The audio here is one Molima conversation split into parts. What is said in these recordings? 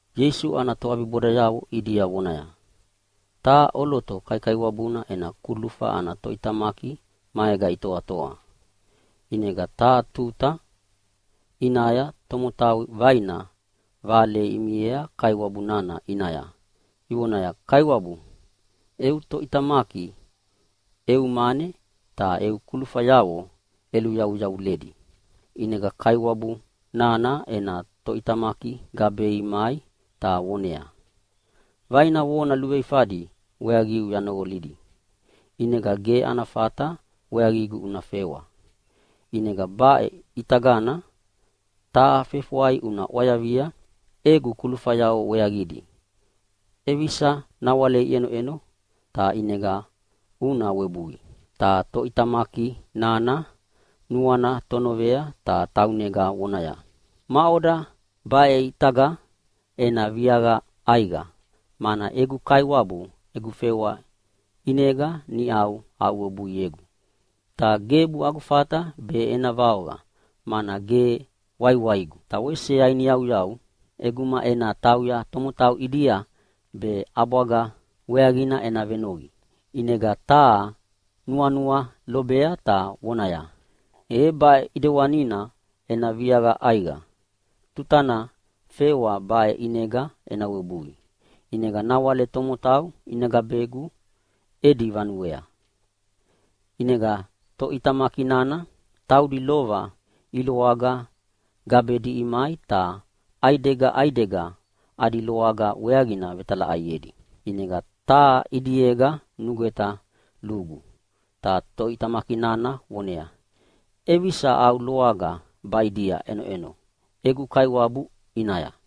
Ieisu ana toʼabibodayavo ʼidia vonaya, “Taha ʼoloto kaikaiwabuna ena kulufa ana toʼitamaki maega itoatoa. ʼInega taha tuta ʼinaya tomotau vaina vale imiea kaiwabu nana ʼinaya ivonaya, ‘Kaiwabu, eu toʼitamaki eu mane ta eu kulufayavo ʼeluveyaveyavuledi.’ “ʼInega kaiwabu nana ena toʼitamaki gabei mai ta voneaya, ‘Vaina vona luveifadi weaqiu yanoqolidi, ʼinega ge ana fata weaqigu una fewa. ʼInega baʼe ʼitagana taha fefwai una ʼwayavia egu kulufayavo weaqidi ʼevisa nawale iʼenoʼeno, ta ʼinega una webui.’ “ʼInega toʼitamaki nana nuana tonovea ta taunega vonaya, ‘Maʼoda baʼe ʼitaga ena viaqa ʼaiqa, mana egu kaiwabu egu fewa ʼinega niʼau aʼuwebuiegu? Ta gebu agu fata be ena vaoqa mana ge waiwaigu, ta wese yainiyauyau ʼeguma ena tauya tomotau ʼidia be ʼabwaga weaqina ena venoqinoqi.’ ʼInega taha nuanua lobea ta vonaya, ‘E baʼe ʼedewanina ena viaqa ʼaiqa tutana fewa baʼe ʼinega ena webui, ʼinega nawale tomotau ina gabegu edi vanuea.’ “ʼInega toʼitamaki nana taudi lova iloaga gabedi imai ta ʼaidega ʼaidega adi loaga weaqina vetalaʼaiedi. ʼInega taha ʼidiega nugweta lugu, ta toʼitamaki nana voneaya, ‘ʼEvisa au loaga baʼidia ʼenoʼeno egu kaiwabu ʼinaya?’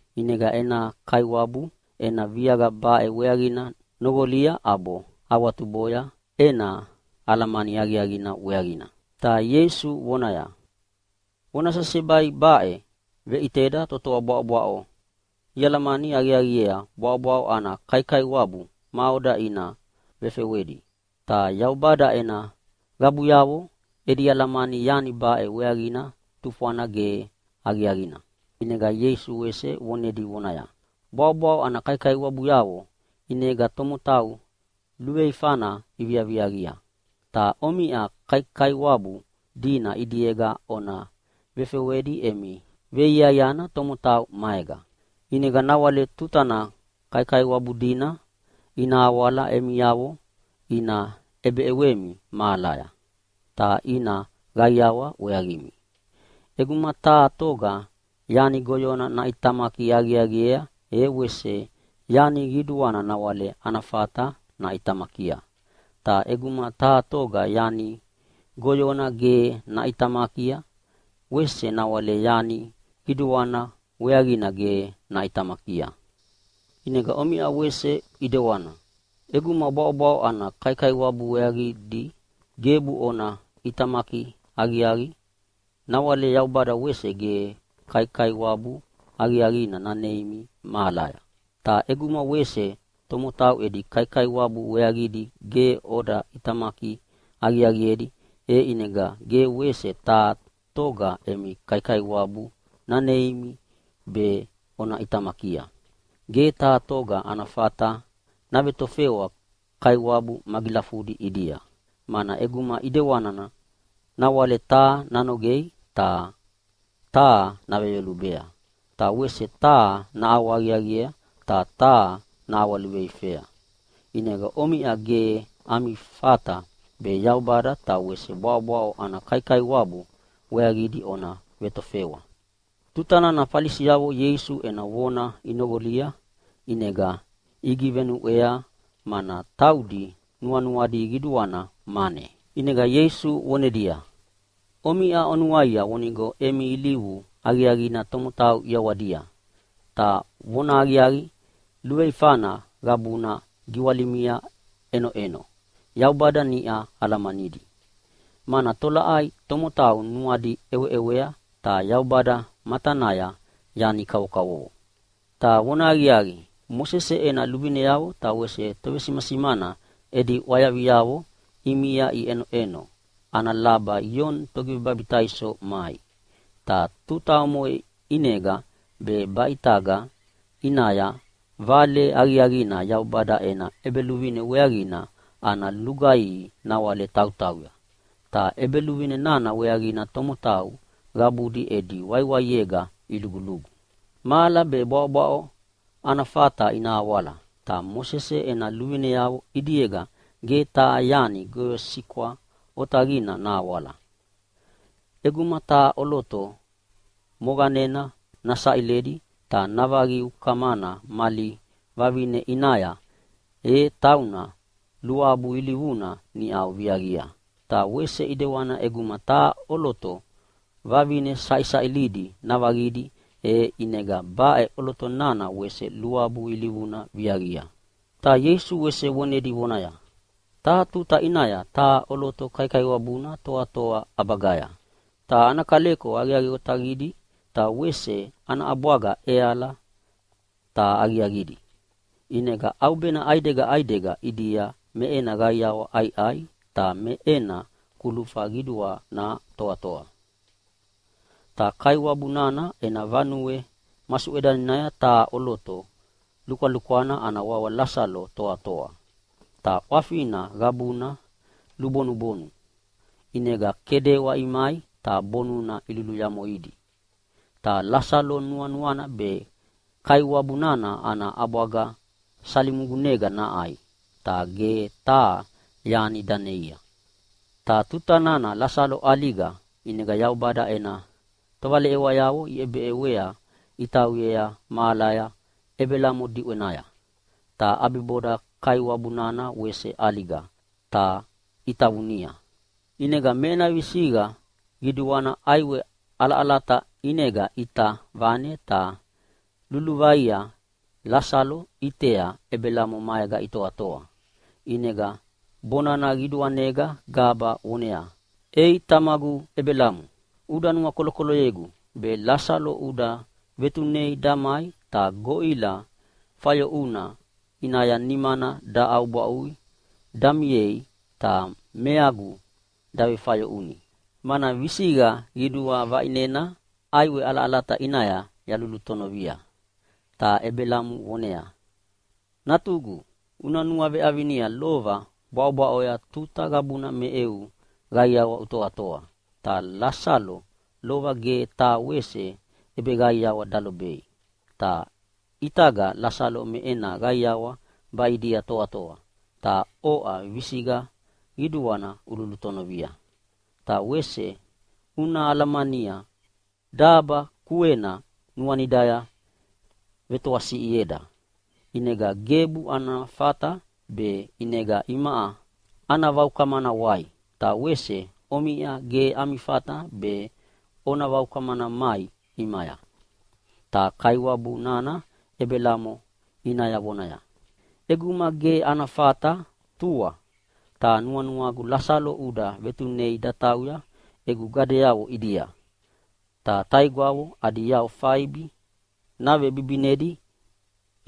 “ʼInega ena kaiwabu ena viaqa baʼe weaqina noqolia ʼabo awatuboya ena alamani aqiaqina weaqina.” Ta Ieisu vonaya, “Vona sesebai baʼe veʼiteda totoa bwaʼobwaʼo ialamani aqiaqiea bwaʼobwaʼo ana kaikaiwabu maʼoda ʼinega ina vefewedi, ta Yaubada ena qabuyavo edi alamani yani baʼe weaqina tufwana ge aqiaqina.” ʼInega Ieisu wese vonedi vonaya, “Bwaʼobwaʼo ana kaikaiwabuyavo ʼinega tomotau luveifana iviaqia. Ta omiʼa kaikaiwabu dina ʼidiega ona vefewedi emi veiaiana tomotau maega. ʼInega nawale tutana kaikaiwabu dina ina awala emiavo ina ʼebeʼewemi mahalaya, ta ina qaiawa weaqimi. ʼEguma taha toga yani goyona naʼitamaki aqiaqiea e wese yani qiduana nawale ana fata naʼitamakia. Ta ʼeguma taha toga yani goyona ge naʼitamakia, wese nawale yani qiduana weaqina ge naʼitamakia. “ʼInega omiʼa wese ʼidewana, ʼeguma bwaʼobwaʼo ana kaikaiwabu weaqidi gebu ona ʼitamaki aqiaqi, nawale Yaubada wese ge kaikaiwabu aqiaqina naneimi mahalega. Ta ʼeguma wese tomotau edi kaikaiwabu weaqina gebu oda ʼitamaki aqiaqiedi, e ʼinega ge wese taha toga emi kaikaiwabu naneimi be ona ʼitamakia. “Ge taha toga ana fata navetofewa kaiwabu magilafudi ʼidia. Mana ʼeguma ʼidewanina nawale taha nanogea ta taha naveyolubea. Ta wese taha naʼawahaqiaqiea ta taha naʼawaluveifea. ʼInega omiʼa ge ana fata be Yaubada ta wese bwaʼobwaʼo ana kaikaiwabu weaqidi ona vetofewa.” Tutana Falisiavo Ieisu ena vona inoqolia ʼinega igivenuʼwea, mana taudi nuanuadi qiduana mane. ʼInega Ieisu vonedia, “Omiʼa onuaia vonigo emi ilivu aqiaqina tomotau ʼiawadia, ta vonahaqiaqi luveifana qabuna giwalimia ʼenoʼeno Yaubada niʼa alamanidi. Mana tolaʼai tomotau nuadi ʼeweʼewea ta Yaubada matanaya yani kavokavovo. “Ta vonahaqiaqi, Mosese ena luvineavo ta wese tovesimasimana edi ʼwayaviavo ʼimia iʼenova ana laba Ioni Togivebabitaiso mai. Ta tuta omoʼe ʼinega be baʼe ʼitaga ʼinaya vale aqiaqina Yaubada ena ʼEbeluvine weaqina ana lugaihi nawale tautauya. Ta ʼEbeluvine nana weaqina tomotau qabudi edi waiwaiega ilugulugu. Mahala be bwaʼobwaʼo ana fata ina awala, ta Mosese ena luvineavo ʼidiega ge taha yani goyosikwa otaqina nahawala. “ʼEguma taha ʼoloto moqanena nasaʼiledi ta navaqi ukamana mali vavine ʼinaya, e tauna luabu ilivuna niʼa viaqia. Ta wese ʼidewana ʼeguma taha ʼoloto vavine saʼisaʼilidi navaqidi, e ʼinega baʼe ʼoloto nana wese luabu ilivuna niʼa viaqia.” Ta Ieisu wese vonedi vonaya, “Taha tuta ʼinaya taha ʼoloto kaikaiwabuna toatoa ʼabagaya. Ta ana kaleko aqiaqi otaqidi ta wese ana ʼabwaga ʼeala ta aqiaqidi. ʼInega ʼaubena ʼaidega ʼaidega ʼidia me ena qaiawa ʼaiʼai, ta me ena kulufa qiduana toatoa. “Ta kaiwabu nana ena vanue masuʼedanaya taha ʼoloto lukwalukwana ana wawa Lasalo toatoa. Ta ʼwafina qabuna lubonubonu, ʼinega kedewa imai ta bonuna iluyamoidi. Ta Lasalo nuanuana be kaiwabu nana ana ʼabwaga salimugunega naʼai, ta ge taha yani daneia. “Ta tuta nana Lasalo ʼaliga ʼinega Yaubada ena tovaleʼewayavo iʼebeʼewea itauyea mahalaya Ebelamo diʼwenaya. Ta ʼabiboda kaiwabu nana wese ʼaliga ta itavunia. ʼInega me ena visiqa qiduana ʼaiwe ʼalaʼalata ʼinega ʼita vane ta luluvaia Lasalo ʼitea Ebelamo maega itoatoa. ʼInega bonana qiduanega gaba voneaya, ‘Ei tamagu Ebelamo! Uda nuakolokoloyegu, be Lasalo uda vetunei damai ta goʼila fayoʼuna ʼinaya nimana daʼaubwaʼui damiei ta meagu dagivefayoʼuni, mana visiqa qidua vaʼinena ʼaiwe ʼalaʼalata ʼinaya yalulutonovia.’ “Ta Ebelamo voneaya, ‘Natugu, una nuaveʼavina lova bwaʼobwaʼoya tuta qabuna me eu qaiawa utoatoa, ta Lasalo lova ge taha wese ʼebeqaiawa dalobei. Ta ʼitaga Lasalo me ena qaiawa baʼidia toatoa, ta oʼa visiqa qiduana ululutonovia. Ta wese una alamania daba kuena nuanidaya vetoasiʼieda. ʼInega gebu ana fata baʼe ʼinega imaʼa ana vaukamana wai. Ta wese omiʼa ge ami fata be ona vaukamana mai ʼimaya.’ “Ta kaiwabu nana Ebelamo ʼinaya vonaya, ‘ʼEguma ge ana fata tua, ta nuanuagu Lasalo uda vetunei datauya egu qabuyavo ʼidia. Ta taigwavo adi yau faibi navebibinedi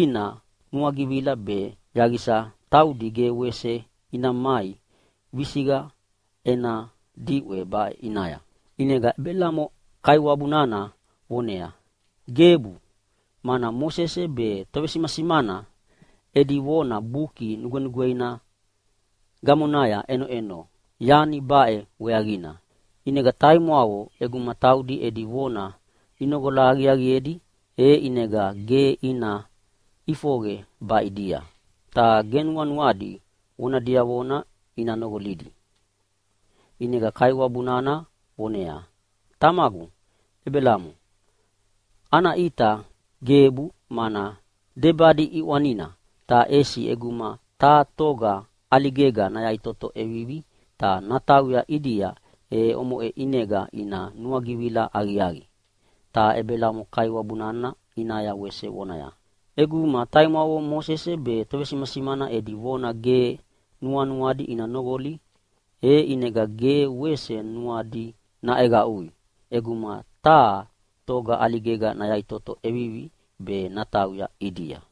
ina nuagivila, be yaqisa taudi ge wese ina mai visiqa ena diʼwe baʼe ʼinaya.’ “ʼInega Ebelamo kaiwabu nana voneaya, ‘Gebu, mana Mosese be tovesimasimana edi vona Buki Nugwenugweina gamonaya ʼenoʼeno yani baʼe weaqina, ʼinega taimwavo ʼeguma taudi edi vona inoqola aqiaqiedi e ʼinega ge ina ʼifoqe baʼidia, ta ge nuanuadi vona diavona ina noqolidi!’ “ʼInega kaiwabu nana voneaya, ‘Tamagu Ebelamo, ana ʼita gebu, mana debadi ʼiʼwana. Ta ʼesi ʼeguma taha toga ʼaligega nayaʼitoto ʼevivi ta natauya ʼidia, e omoʼe ʼinega ina nuagivila aqiaqi.’ “Ta Ebelamo kaiwabu nana ʼinaya wese vonaya, ‘ʼEguma taimwavo Mosese be tovesimasimana edi vona ge nuanuadi ina noqoli, e ʼinega ge wese nuadi naʼeqaʼui ʼeguma taha toga ʼaligega nayaʼitoto ʼevivi be natauya ʼidia.’”